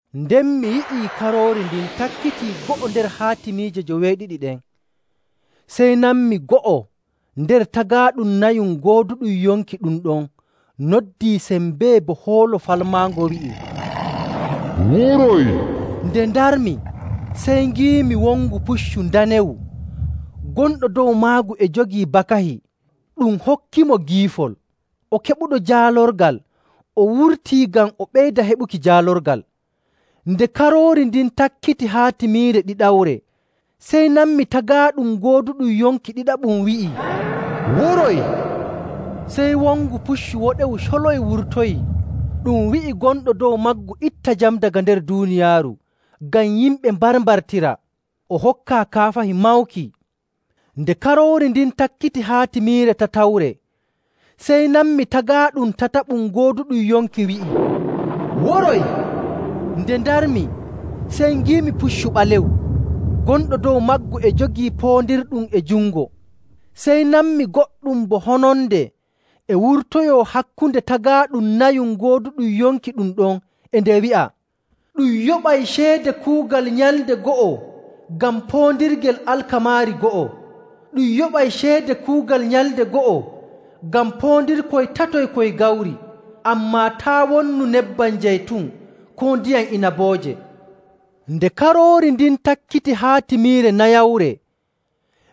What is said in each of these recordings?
Nden mi yi'i Karoori ndin takkitii go'o nder haatimiije joweeɗiɗi ɗen. Sey nanmi go'o nder tagaaɗum nayum gooduɗum yonki ɗum ɗon noddii sembee bo hoolo falmaango wi'i, “Woroy!” Nde ndarmi sey ngiimi wongu puccu ndanewu. Gonɗo dow maggu e jogii bakahi, ɗum hokkimo giifol. O keɓuɗo jaalorgal o wurtii ngam o ɓeyda heɓuki jaalorgal. Nde Karoori ndin takkiti haatimiire ɗiɗawre, sey nanmi tagaaɗum gooduɗum yonki ɗiɗaɓum wi'ii, “Woroy!” Sey wongu puccu woɗewu coloy wurtoyii ɗum wi'i gonɗo dow maggu itta jam daga nder duuniyaaru, ngam yimɓe mbarmbartira. O hokkaa kaafahi mawki. Nde Karoori ndin takkiti haatimiire tatawre sey nanmi tagaaɗum tataɓum gooduɗum yonki wi'ii, “Woroy!” Nde ndarmi sey ngiimi puccu ɓalewu. Gonɗo dow maggu e jogii poondirɗum e jungo. Sey nanmi goɗɗum bo hononde e wurtoyoo hakkunde tagaaɗum nayum gooduɗum yonki ɗum ɗon e nde wi'a, “Ɗum yoɓay ceede kuugal nyalnde go'o ngam poondirgel alkamaari go'o. Ɗum yoɓay ceede kuugal nyalnde go'o ngam poondirkoy tatoy koy gawri. Ammaa taa' wonnu nebbam jaytun koo ndiyam inabooje.” Nde Karoori ndin takkiti haatimiire nayawre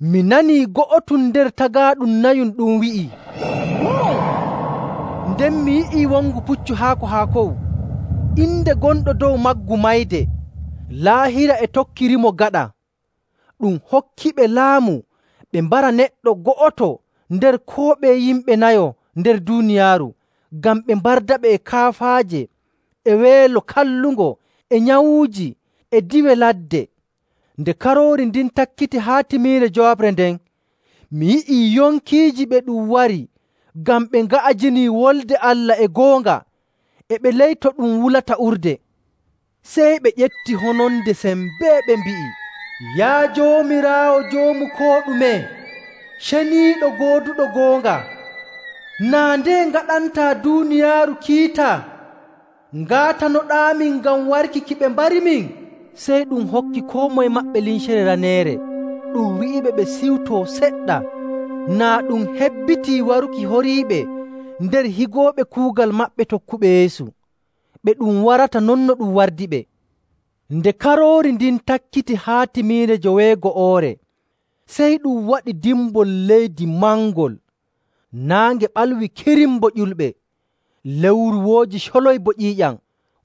mi nanii go'otum nder tagaaɗum nayum ɗum wi'ii, “Woroy!” Nden mi yi'ii wongu puccu haako haakowu. Inde gonɗo dow maggu Mayde, Laahira e tokkirimo gaɗa. Ɗum hokkiɓe laamu ɓe mbara neɗɗo go'oto nder koo ɓeye yimɓe nayo nder duuniyaaru ngam ɓe mbardaɓe e kaafaaje, e weelo kallungo, e nyawuuji, e diiwe ladde. Nde Karoori ndin takkiti haatimiire njowaɓre nden, mi yi'ii yonkiiji ɓe ɗum wari ngam ɓe nga'ajinii Wolde Allah e goonga. E ɓe ley to ɗum wulata urde. Sey ɓe ƴefti hononde sembee ɓe mbi'i, “Yaa Joomiraawo Joomu koo ɗume, ceniiɗo, gooduɗo goonga, naa ndeye ngaɗantaa duuniyaaru kiita ngaatanoɗaamin ngam warki ki ɓe mbarimin?” Sey ɗum hokki koo moye maɓɓe limcere raneere, ɗum wi'iɓe ɓe ciwtoo seɗɗa, naa ɗum hebbitii waruki horiiɓe nder higooɓe kuugal maɓɓe tokkuɓe Yeesu, ɓe ɗum warata non no ɗum wardiɓe. Nde Karoori ndin takkiti haatimiire joweego'oore, sey ɗum waɗi dimbol leydi mangol. Naange ɓalwi kirim bo ƴulɓe. Lewru wooji coloy bo ƴiiƴam.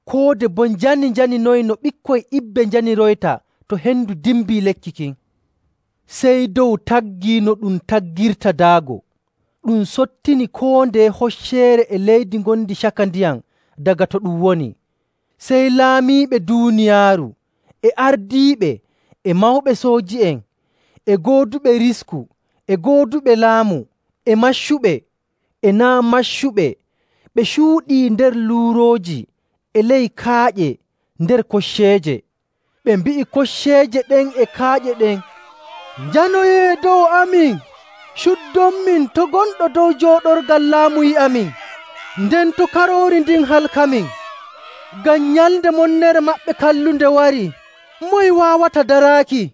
Koode boo njani njaninoyi no ɓikkoy ibbe njaniroyta to hendu dimbii lekki kin. Sey dow taggii no ɗum taggirta daago, ɗum sottini koo ndeye hocceere e leydi ngondi caka ndiyam daga to ɗum woni. Sey laamiiɓe duuniyaaru, e ardiiɓe, e mawɓe sooji'en, e gooduɓe risku, e gooduɓe laamu, e maccuɓe, e naa' maccuɓe ɓe cuuɗii nder luurooji e ley kaaƴe nder kocceeje. Ɓe mbi'i kocceeje ɗen e kaaƴe ɗen, “Njanoyee dow amin, cuuɗonmin to' gonɗo dow jooɗorgal laamu yi'amin, nden to' Karoori ndin halkamin. Ngam nyalnde monnere maɓɓe kallunde warii. Moye waawata daraaki?”